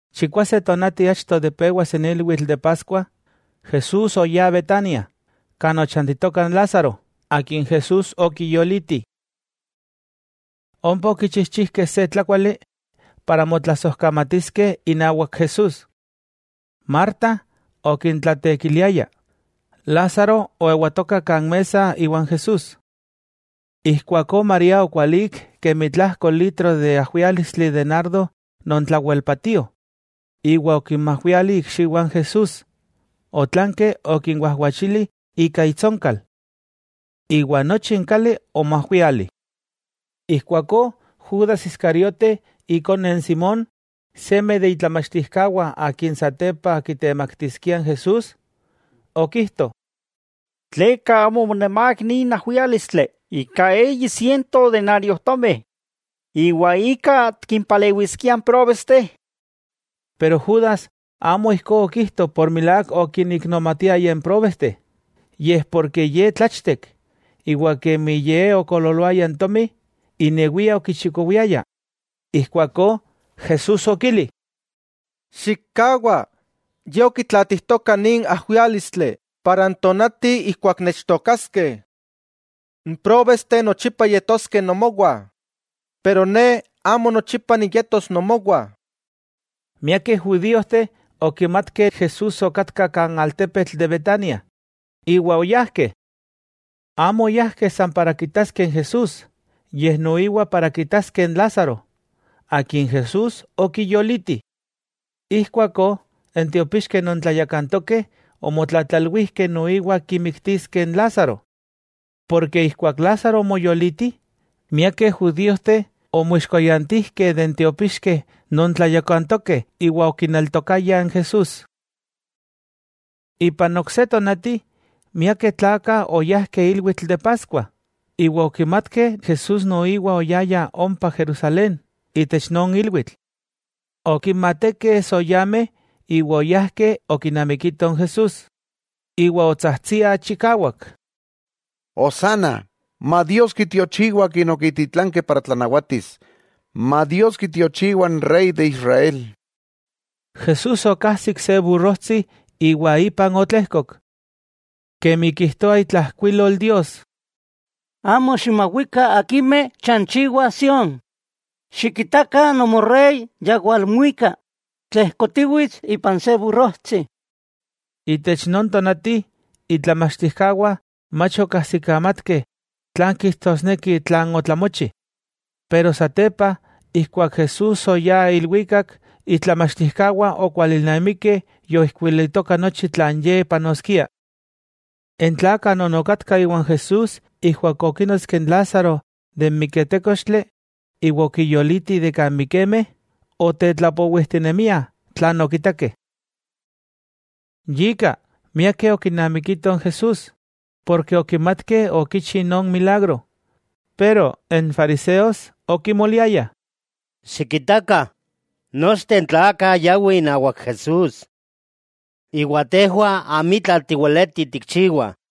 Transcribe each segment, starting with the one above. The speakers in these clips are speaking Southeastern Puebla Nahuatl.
Chikwase tonati achto de pewas n ilwitl de Paskua, Jesús oyá Betania, kan ochantitoka n Lázaro, akin Jesús okiyoliti. Ompa okichijchijkeh se tlákuali para motlasojkamatiskeh inawak Jesús, Marta okintlatekiliaya, Lázaro oewatoka kan mesa iwan Jesús. Ijkuakó María okualík kemi tlajko litro ajwiálistli de nardo non tlawel patio, iwa okinmajwiali ikxiwah n Jesús, otlanki okinwajwachili ika itsonkal. Iwa nochi n kali omoajwiali. Ijkuakó Judas Iskariote ikone n Simón, seme de itlamachtijkawah akin satepa kitemaktiskia n Jesús, okijto: —¿Tleka amo omonamák nin ajwiálistli ika eyi siento denariojtomi, ika tikimpalewiskiah n próbesteh? Pero Judas amo ijkó okijto por milák okinmiknomatiaya n próbesteh, yej porke ye tlachtek, iwa kemi ye okoololoaya n tomi, inewia okichikowiaya. Ijkuakó Jesús okili: —Xikkawa, ye okitlaatijtoka nin ajwiálistli para n tonati ijkuak nechtookaskeh. N próbesteh nochipa yetoskeh nomowah, pero Ne amo nochipa niyetos nomowah. Miakeh judiojteh okimatkeh Jesús okatka kan altepetl de Betania, iwa oyajkeh. Amo oyajkeh san para kitaskeh n Jesús, yej noiwa para kitaskeh n Lázaro, akin Jesús okiyoliti. Ijkuakó n tiopixkeh non tlayakantokeh omotlatlalwijkeh noiwa kimiktiskeh n Lázaro. Porke ijkuak Lázaro omoyoliti, miakeh judíojteh omoixkoyantijkeh de n tiopixkeh non tlayakantokeh iwa okineltokayah n Jesús. Ipan ok se tonati, miakeh tlakah oyajkeh ilwitl de Paskua, iwa okimatkeh Jesús noiwa oyaya ompa Jerusalén itech non ilwitl. Okinmatekeh soyameh iwa oyajkeh okinamikitoh n Jesús, iwa otsajtsia chikawak: —¡Hosanna! Ma Dios kitiochiwa Akin okititlankeh matlanawati! ¡Ma Dios kitiochiwa n Rey de Israel! Jesús okajsik se burrojtsi iwa ipan otlejkok. Kemi kijtoa itlajkuilol Dios: Amo ximawikah akimeh chanchiwah Sión; xikitakah nomorey ya walmuika, tlejkotiwits ipan se burrojtsi. Itech non tonati itlamachtijkawah mach okajsikamatkeh tlan kijtosneki tlan otlamochi, pero satepa ijkuak Jesús oyá ilwikak, itlamachtijkawah okualilnamikeh yoijkuilitoka nochi tlan Ye panoskia. N tlakah non okatkah iwan Jesús ijkuak okínotski n Lázaro ijtik miketékochtli iwa okiyoliti de kan mikemeh, otetlapowijtinemiah tlan okitakeh. Yika, miakeh okinamikitoh n Jesús, porke okimatkeh okichi non milagro. Pero n fariseos okimoliayah: —Xikitakah, nochteh n tlakah yawih inawak Jesús. Iwa tejwah amitla tiweleti tikchiwah.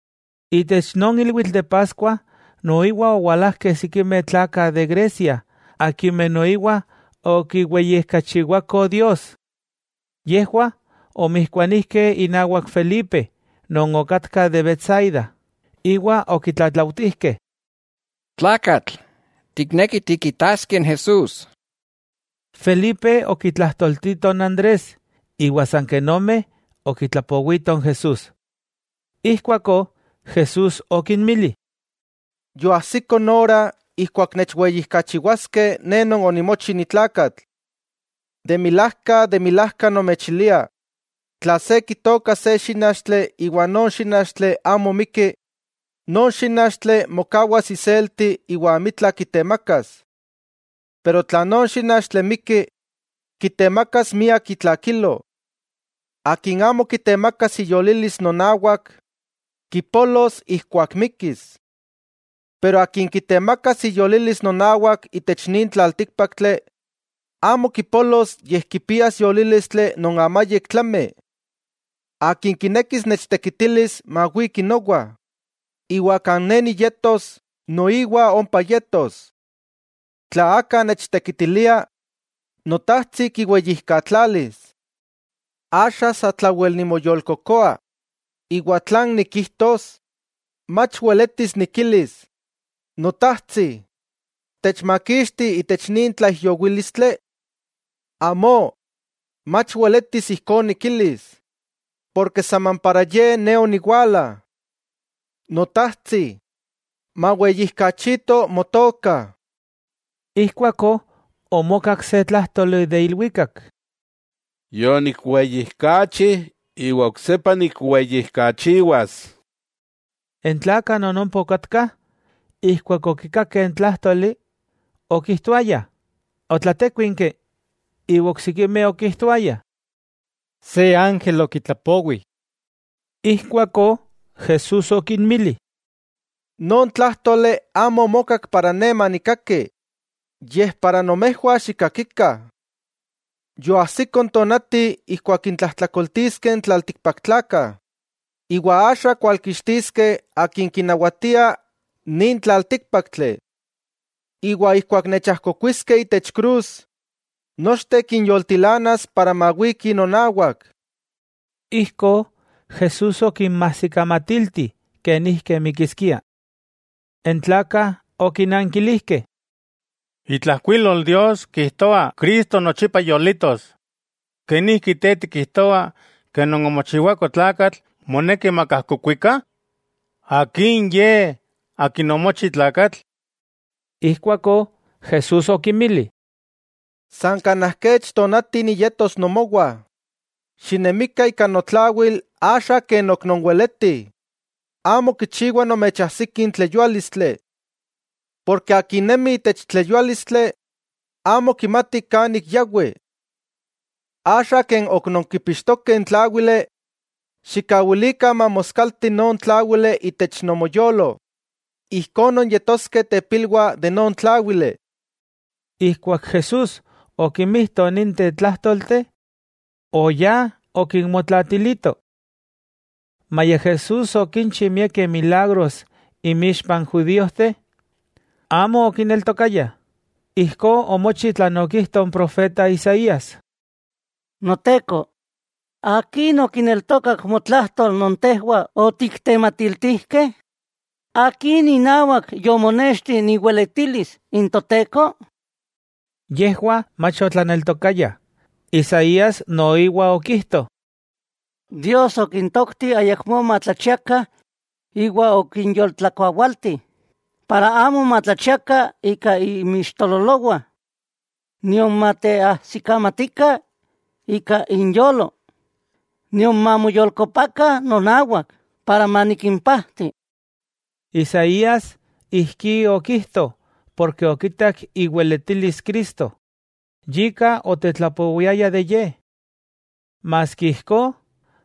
Itech non ilwitl de Paskua noiwa owalajkeh sikimeh tlakah de Grecia akimeh noiwa okiweyijkachiwakoh Dios. Yejwah omijkuanijkeh inawak Felipe non okatka de Betsaida, iwa okitlatlautijkeh: —Tlakatl, tiknekih tikitaskeh n Jesús. Felipe okitlajtoltito n Andrés; iwa san ken ome okitlapowitoh n Jesús. Ijkuakó Jesús okinmili: —Yoajsiko n ora ijkuak nechweyijkachiwaskeh Ne Non onimochi ni tlakatl. De milajka, de milajka nomechilia, tla se kitooka se xínachtli iwa non xínachtli amo miki, non xínachtli mokawas iselti iwa amitla kitemakas. Pero tla non xínachtli miki, kitemakas miak itlakilo. Akin amo kitemakas iyolilis nonawak, kipolos ijkuak mikis. Pero akin kitemakas iyolilis nonawak itech nin tlaltíkpaktli amo kipolos yej kipias yolílistli non amayik tlami. Akin kinekis nechtekitilis, mawiki nowa, iwa kan Ne niyetos, noiwa ompa yetos. Tla aka nechtekitilia, Notajtsi kiweyijkatlalis. 'Axa satlawel nimoyolkokoa, ¿Iwa tlan nikijtos? ¿Mach weletis nikilis: “Notajtsi, techmakixti itech nin tlaijyowílistli”? Amó, mach weletis ijkó nikilis porke saman para ye Ne oniwala. Notajtsi, maweyijkachito Motoka. Ijkuakó omokak se tlájtoli de ilwikak: —Yonikweyijkachi iwa oksepa nikweyijkachiwas. N tlakah non ompa okatkah, ijkuak okikakeh n tlájtoli, okijtoayah, otlatékuinki, iwa oksikimeh okijtoayah: —Se ángel okitlapowi. Ijkuakó Jesús okinmili: —Non tlájtoli amo omokak para Ne manikkaki, yej para nomejwah xikkakikah. Yoajsiko n tonati ijkuak kintlajtlakoltiskeh n tlaltikpaktlakah, iwa axa kualkixtiskeh akin kinawatia nin tlaltíkpaktli. Iwa ijkuak nechajkokuiskeh itech krus, nochteh nikinyoltilanas para mawikih nonawak. Ijkó Jesús okinmajsikamatilti kenijki mikiskia. N tlakah okinankilijkeh: —Itlajkuilol Dios kijtoa Cristo nochipa yolitos. ¿Kenijki Te tikijtoa non omochiwako tlakatl moneki makajkokuikah? ¿Akin ye akin omochi tlakatl? Ijkuakó Jesús okinmili: —San kanaj kech tonati niyetos nomowah. Xinemikah ika notlawil axa ken ok nonweletih, amo kichiwa nomechajsiti n tleyuálistli. Porke akin nemi itech tleyuálistli amo kimati kan ik yawi. Axa ken ok nonkipixtokeh n tláwili, xikkawilikah mamoskaltih non tláwili itech nomoyolo, ijkó nonyetoskeh tepilwah de non tláwili. Ijkuak Jesús okimijto ninteh tlájtolteh, oyá okinmotlaatilito. Maya Jesús okinchi miakeh milagros inmixpah n judíojteh, amo okineltokayah. Ijkó omochi tlan okijto n profeta Isaías: Noteko, ¿akin okineltokak motlajtol non tejwah otiktematiltijkeh? ¿Akin inawak yomonexti iweletilis n Toteko? Yejwah mach otlaneltokayah, Isaías noiwa okijto: Dios okintokti ayakmó matlachiakah iwa okinyoltlakuawaltih, para amo matlachiakah ika inmixtololowah nion mateajsikamatikah ika inyolo, nion mamoyolkopakah nonawak, para manikimpajti. Isaías ijkí okijto porke okitak iweletilis Cristo, yika otetlapowiaya de Ye. Maski ijkó,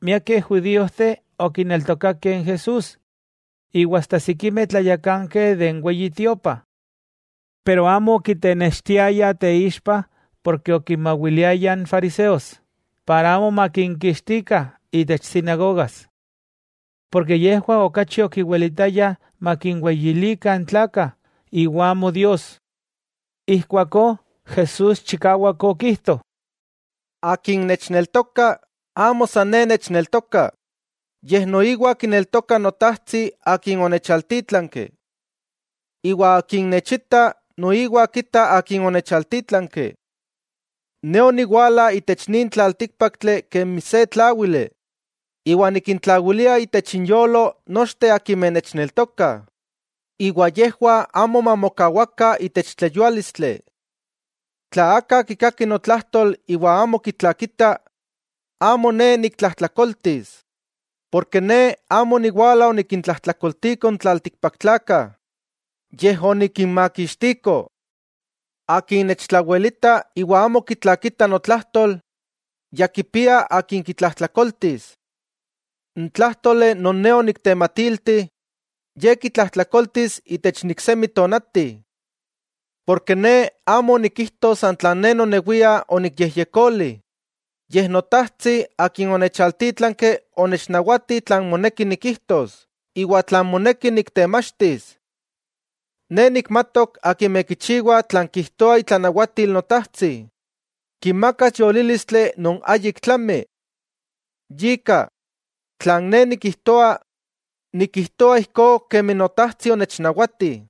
miakeh judiojteh okineltokakeh n Jesús, iwa asta sikimeh tlayakankeh itech Weyi Tiopa. Pero amo okitenextiayah teixpa porke okinmawiliayah n fariseos, para amo makinkixtikah itech sinagogas. Porke yejwah okachi okiwilitayah makinweyilikah n tlakah iwa amo Dios. Ijkuakó Jesús chikawak okijto: —Akin nechneltoka, amo san Ne nechneltoka, yej noiwa kineltoka Notajtsi Akin onechaltítlanki. Iwa akin nechita, noiwa kita Akin onechaltítlanki. Ne oniwala itech nin tlaltíkpaktli kemi se tláwili, iwa nikintlawilia itech inyolo nochteh akimeh nechneltokah, iwa yejwah amo mamokawakah itech tleyuálistli. Tla aka kikaki notlajtol iwa amo kitlakita, amo Ne niktlajtlakoltis. Porke Ne amo oniwala onikintlajtlakoltiko n tlaltikpaktlakah, yej onikinmakixtiko. Akin nechtlawelita, iwa amo kitlakita notlajtol, ya kipia akin kitlajtlakoltis: N tlájtoli non Ne oniktematilti, ye kitlajtlakoltis itech n iksemi tonati. Porke Ne amo onikijto san tlan Ne nonewia onikyejyekoli, yej Notajtsi Akin onechaltítlanki onechnawati tlan moneki nikijtos iwa tlan moneki niktemachtis. Ne nikmatok akimeh kichiwa tlan kijtoa itlanawatil Notajtsi, kinmakas yolílistli non ayik tlami. Yika, tlan Ne nikijtoa, nikijtoa ijkó kemi Notajtsi onechnawati.